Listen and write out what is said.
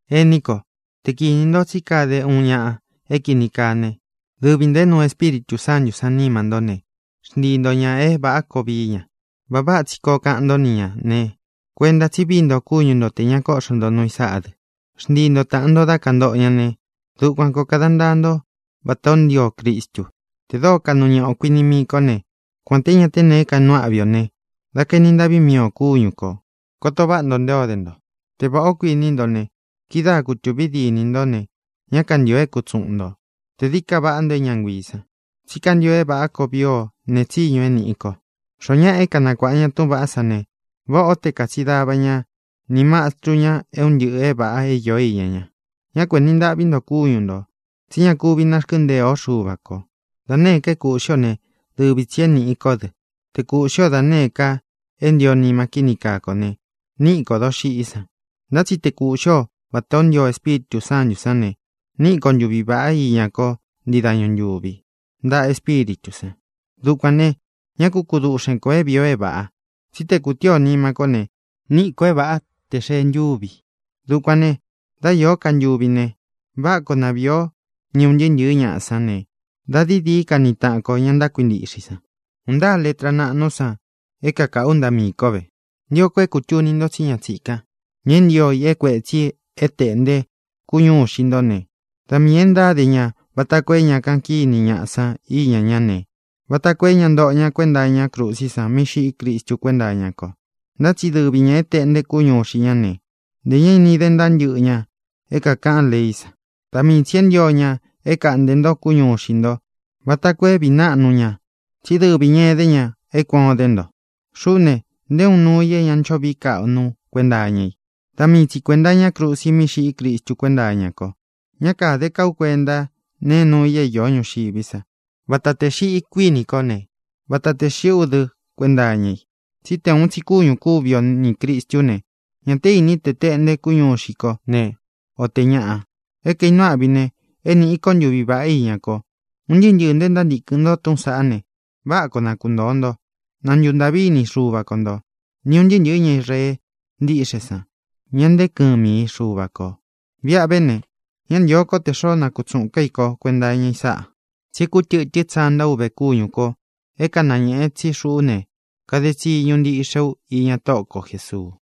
Ení ko, te kinī ntó tsí kade uun ñaꞌa é kīni kaa né, dɨvi ntō é nuu Espíritū Sántū sán nima ntó ne, xntii nto ñā é vāꞌá koo vií ña. Vāꞌa váꞌa tsi kōo kaꞌan ntó ni ñā ne, kuenta tsi vií nto kúñu nto tē ña kóꞌxo nto nuu i sáꞌā dɨ. Xntii nto tāꞌan nto dá kantoꞌo ña ne, dukuan kōo kada ntaa ntó vata ō ntío Cristu. Tē dóo kaꞌnu ñaꞌa ō kuiní mii kō né, kuān té ña te nee kainuu áꞌvi ō ne, da kaeni ntaꞌví mii ō kúñu kō. Koto váꞌa nto nté o de nto. Te vāꞌá ō, kuiní nto ne, kidáa kuvi kutūvi dínī ntó ne, ñá kantīo é kutsuꞌun nto tē dií ka vaꞌá nto é ña nguiī san. Tsí kantio é vāꞌá koo vii o nēe tsíñu é nīꞌi ko. Xoó ñaꞌa é kanakuāꞌa ña túꞌūn vaꞌá san ne, váꞌā ó te kātsin dava ña ni mastru ña é un ntɨꞌɨ̄ é vāꞌa é īó iña ña. Ñá ku enī ntaꞌví nto kúñu ntō, tsí ña kúvi nārkɨ́ntēe o Xuva ko. Da nēé ka é kūꞌxí ō né, dɨvi tsī é nīꞌi kó dɨ. Te kūꞌxí o da nēé ka é ntio nima kíni kaa kō ne, níꞌi kō doxiꞌí san. Ntá tsi te kūꞌxí o vatā ó ntio Espíritū Sántū sán ne, níꞌi ko ntuvi vāꞌá iña ko ntii dañu ntūvi ntaꞌa Espíritū san. Dukuān ne, ñá ku kuduꞌxen kō é vīi o é vāꞌa, tsí te kūtíi o nima kó ne, níꞌi kō é vāꞌa te xee ntúvi i. Dukuān ne, dá īó ka ntuvi ne, váꞌa koo na vīi o ni un ntɨɨ́ ntɨ̄ɨ́ ñaꞌa sán ne, dā dií dií ka ni taꞌan ko, ña ntákuintiꞌxe i san. ¡Un ntáa letra naꞌnú san é kaꞌū ú ntaꞌa miī kó ve! Ntio ko é kūtuni nto tsí ña tsīkán, ña é ntio i é kuētsi é tēꞌnte kúñu ixi nto ne, da miī e ntáde ña vata koo é ña kaꞌan kíni ñaꞌa san íña ñá ne, vata koo é ña ntóꞌo ña kuenta iñá krusí san mí xiꞌí Cristu kuénta iña ko. Ntá tsi dɨvi ñā é tēꞌnte kúñu ixi ña ne, ntē ña ini de ntaa ntɨ́ꞌɨ ña é kākaꞌán leí san. Da mii tsī é ntio ña é kaꞌntē ntó kúñu ixi nto vata koo é vīí naꞌnu ña tsí dɨvi ñā edé ña e kuán o dé nto. Xuꞌú ne, nté uun nuu i é ña ncho vií kaꞌnu ú kuenta iña i; da mii tsi kuēnta iñá krusi mí xiꞌí Cristu kuénta iña ko. Ñá kāde ká u kuenta nee nuu i é īó ñuxiví sa. Vata tē xiꞌi, kuíni kó ne, vata tē xiꞌí u dɨ kuenta iña i. Tsí te ūun tsi kúñū kúvi o nī Cristú ne, ñā té ini te teꞌnte kúñu ixi ko ne, o tē ñaꞌa. E kaínuu áꞌvi ne, é nīꞌi ko ntuví vaꞌá iña ko. Un ntɨɨ́ ntɨɨ̄ nto e ntántīkɨn nto túꞌūn saꞌá ne, váꞌa koo na kuntōo nto. Na ntuntāꞌví ini Xuva ko ntō, ni ūn ntɨɨ́ ntɨ̄ɨ́ ña Israee ntíꞌxe san, ña nteé kɨmi i Xuva kō. Viꞌa ve ne, ñá ntīo kó tē xoó nakutsuꞌūn ká i kó kuenta iña i sáꞌā. Tsi é kūtɨtɨ́n tsanta uve kúñū ko é kanañēꞌe tsí xuꞌú ne, kade tsiñu ntiꞌxe u iña Tóꞌo ko Jēsuu.